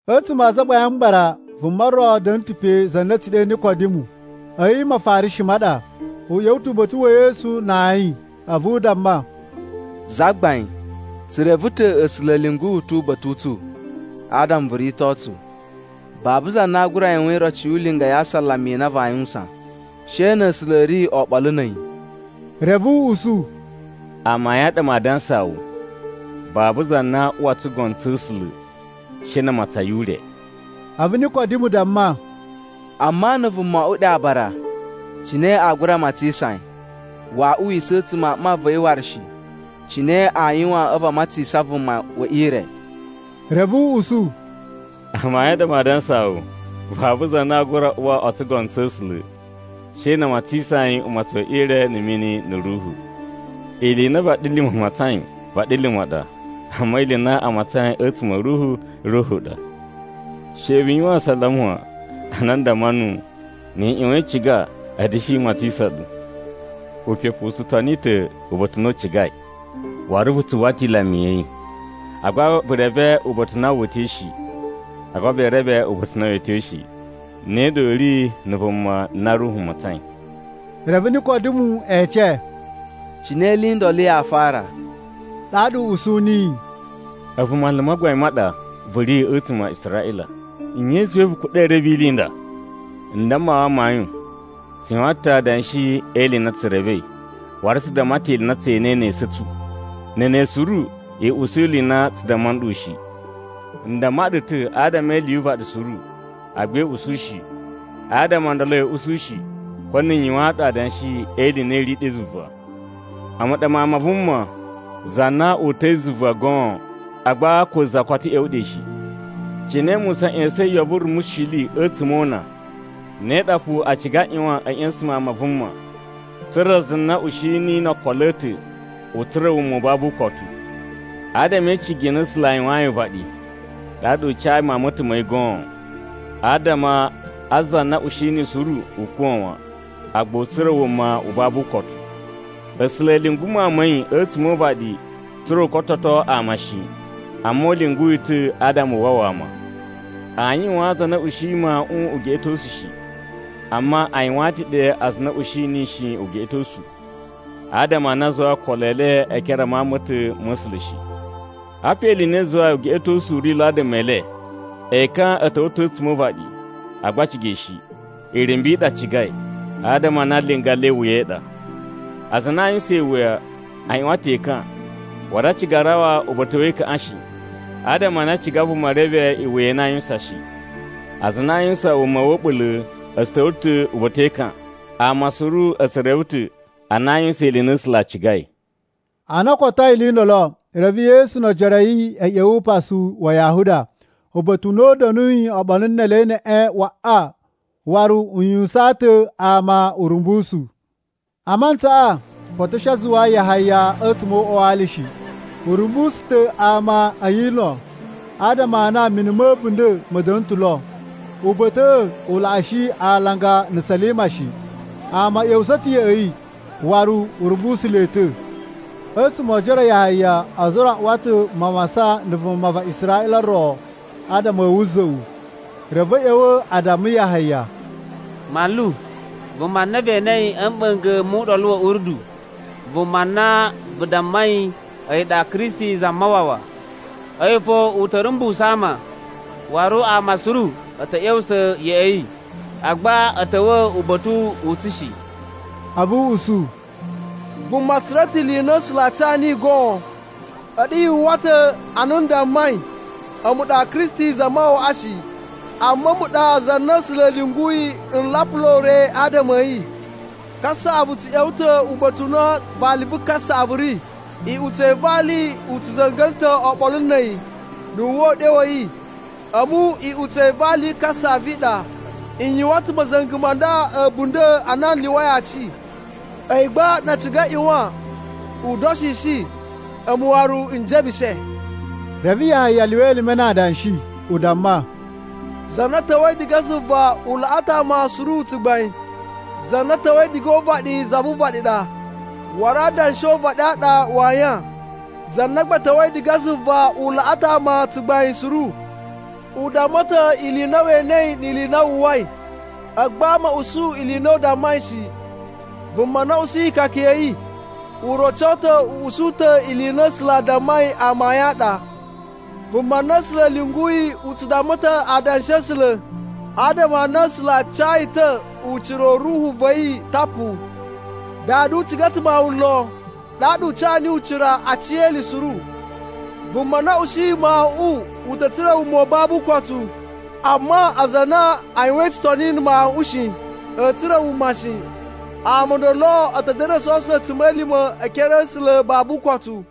A̱tsuma̱ a Azagbain a Mbara, vuma ro da̱na̱ ta̱ pe za na a̱ tsu ɗe Nikodimu, a̱yi Mafarishi ma ɗa. U ꞌya̱wa̱ ta̱ uba̱ta̱ wa̱ Yesu na ayin, a̱vu u damma, “Zagbain, tsu reve ta̱ A̱sula̱ a̱ lyungu wu ta̱ uba̱ta̱ u tsu adama vu rito tsu. Babu za na aa gura yuwan iroci yu ulinga ya asalama i na vaa yuwusan, she na̱ A̱sula̱ a̱ ri oɓolo na̱ a̱yi.” Reve u usu, “Amayun a ɗa maa dansaa wu, babu za na aa uwa o tsugono tsa̱ A̱sula̱ she na a matsan yi ure.” A̱vu Nikodimu damma, “Amma na̱ vuma o oꞌwo ɗe aabara, cine aa gura matsisan yi? Waa uwisa a̱a̱tsuma̱ a mma va̱ yi waru shi. Cine aa yuwan a̱vu a matsisan vuma we ire?” Reve u usu, “Amayun a ɗa maa dansaa wu, babu za na aa gura uwa a̱tsuma̱ o tsugono tsa̱ A̱sula̱, she na a matsisan yi umatsun we ire na̱ mini na̱ Ruhu. Ili i na vaɗilima̱ matsain vaɗilima̱ ɗa, amma ili i na a matsain a̱tsuma̱ a̱ Ruhu, Ruhu ɗa. She vu yuwan asalama wan a na n damma nuwu, ‘Ni i ꞌyuwan i ciga a̱a̱ da̱shi matsisan ɗu.’ Upepu u tsu toni ta̱ uba̱ta̱ u na u cigai, waru vu tsu uwwa ta̱ ilama ya̱ yi, agba vu reve uba̱ta̱ u na wu uta̱i shi, agba vee reve uba̱ta̱ u na wee tyo shi. Ne ɗa u ri na̱ vuma na Ruhu matsain.” Reve Nikodimu ece, “Cine ili i ndolo yaa fara?” Ɗaɗa u usu niyi, “A̱vu manlu ma gbain ma ɗa vu ri a̱tsuma̱ a Israꞌila. Nye i zuwai vu kuɗa̱i e reve ili i nda? N damma wu amayun, tsu yuwan ta̱ adanshi e ili i na tsu revei, waru tsu damma ta̱ ili i na tse enei ne esu a̱ tsu, na̱ ne suru i usu ili i na tsu damma nɗu shi. N damma ɗu ta̱ adama e ili yu uvaɗi suru, agba i usu shi. Adama o ndolo ya̱a̱ usu shi, ko na̱ n yuwaan ɗu adanshi e ili i na i ri ɗe zuva. A̱mu ɗa Mawun ma Vuma, za na uta̱i zuva goon, agba ko za koto ꞌya̱wa̱ ɗe shi. Cine Musa ꞌya̱sa̱in yo vu rumushili a̱tsuma̱ o una, ne ɗa fo a ciga a ꞌyuwan a̱a̱ ꞌya̱sa̱n Mawun ma Vuma, tsa̱ra̱ za na ushi niyi no okolo a̱ ta̱ u tsura̱ wuma u babu ukotu. “Adama e icigi i na A̱sula̱ a yuwayin uvaɗi, ɗaɗa u cayi Mawun ma̱ ta̱ ma̱ yi goon, adama a za na ushi niyi suru u kuwa̱ wan, agba u tsura̱ wuma u babu ukotu. A̱sula̱ a̱ lyungu Mawun ma̱ yi a̱tsuma̱ o uvaɗi tsa̱ra̱ u kototo ama shi. Amma u lyungu yi ta̱ adama u wawa ama. Aa yuwaan aza a na a̱ ushiyi Mawuꞌun ugeꞌetosu shi. Amma a yuwaan ta̱ ɗe aza a na a̱ ushi niyi shi ugeꞌetosu, adama a na a zuwai okolo e le e ekere a Mawun ma̱ ta̱ ma̱ A̱sula̱ shi. Apa ili i na i zuwai ugeꞌetosu u ri lo adama e le: Ekan a̱ ta̱wa̱ ta̱ a̱tsuma̱ o uvaɗi, agba a ciga yi shi. Irumbu i ɗa a cigai, adama a na linga le iwuya i ɗa. Aza a na a yuwusan iwuya a ꞌyuwan ta̱ ekan, waru a ciga a rawa uba̱ta̱ we ekaꞌan shi, adama a na a ciga vuma reve iwuya i na aa yuwusan shi. Aza a na a yuwusan wuma wa̱ a̱ɓula̱ a̱ tsu ta̱wa̱ ta̱ uba̱ta̱ e ekan, ama suru a̱ tsu reve ta̱ a na a yuwusan ili i na A̱sula̱ a cigai.” Ana o kotoi ili i ndolo, reve Yesu no ojoro a̱ yi a̱ ꞌya̱wa̱ upasu wa Yahuda, uba̱ta̱ u na u da̱nuyi oɓolo ne ele neꞌen waꞌa. Waru u yuwusaan ta̱ ama urumbusu. A mantsaꞌa koto a̱ shi a zuwa Yahaya a̱tsuma̱ o uꞌwa wa ali shi. U rumbusu ta̱ ama a Ayino, adama a na mini ma̱ a̱bunda̱ ma̱ da̱na̱ ta̱ lo. (Uba̱ta̱ꞌa̱ u laꞌashi alanga na̱ Salima shi.) Ama a̱ ꞌya̱wusa̱ ta̱ ya̱ꞌa̱ yi, waru u rumbusu le ta̱. A̱tsuma̱ o ojoro a Yahaya ozo o ro a uwa ta̱ mawasan na̱ vuma va Israꞌila ro adama a̱ wuza̱ꞌu. Reve a̱ ꞌya̱wa̱ a damma Yahaya, “Manlu, vuma na ve enei a̱ mɓa̱nga̱ mu Uɗolu wa̱ Urdu, vuma na vu dammai a̱yi ɗa Kristi Zamawawa, a̱yi fo u ta̱ rumbusu ama. Waru ama suru a̱ ta̱ ꞌya̱wusa̱ ya̱ꞌa̱ yi, agba a̱ ta̱wa̱ uba̱ta̱ u tsu shi.” A̱vu u usu, “Vuma tsu tsura̱ ta̱ ili i na A̱sula̱ a ca niyi goon. A̱ɗu yu uwwa ta̱ ana n dammai, ‘A̱mu ɗa Kristi Zamawawaꞌa shi, amma a̱mu ɗa za na A̱sula̱ a̱ lyunguyi n lapula ure adama a̱ yi.’ Kasaꞌavu tsu ꞌya̱wa̱ ta̱ uba̱ta̱ u na vali vu kasaꞌavu ri. Iꞌutsa̱ i valiꞌi u tsu za̱nga̱na̱ ta̱ oɓolo na̱ a̱yi, na̱ wu uwwa uɗyo wa̱ yi. A̱mu iꞌutsa̱ i vali vu kasaꞌavu i ɗa, n yuwan ta̱ ma̱za̱nga̱ ma̱ a̱bunda̱ a na u lyuwai aci. A̱yi gba na a ciga a ꞌyuwan u da̱shishi, a̱mu waru n jebushe.” Reve Yahaya lyuwa elime na adanshi u damma, “Za na ta̱wa̱i diga zuva u laꞌa ta̱ ama suru tsugbain. Za na ta̱wa̱i diga o uvaɗi za vu uvaɗi ɗa, waru adanshi o uvaɗi a ɗa u ri a yan. Za na gba ta̱wa̱i diga zuva u laꞌa ta̱ ama tsugbain suru. U damma ta̱ ili i na we enei ni ili i na wu uwwai, agba ama a̱ usu ili i na u dammai shi. Vuma na ushiyi ikaka ya̱ yi, u roco ta̱ u usu ta̱ ili i na A̱sula̱ a dammai amayun a ɗa. Vuma na A̱sula̱ a̱ lyunguyi u tsu damma ta̱ adanshi a̱ A̱sula̱, adama a na A̱sula̱ a ca yi ta̱ ucira u Ruhu va̱ yi tapu. Dada u ciga ta̱ Mawun lon, ɗaɗa u ca niyi ucira a aci e ili suru. Vuma na ushiyi Mawuꞌun u ta̱ tsura̱ wuma u babu ukotu, amma aza a na a yuwain tsutoni na̱ Mawuꞌun shi, a̱a̱ tsura̱ wuma shi. Ama o ndolo a̱ ta̱ da̱na̱ o sowuso a̱tsuma̱lima̱ e ekere a̱ A̱sula̱ babu ukotu.”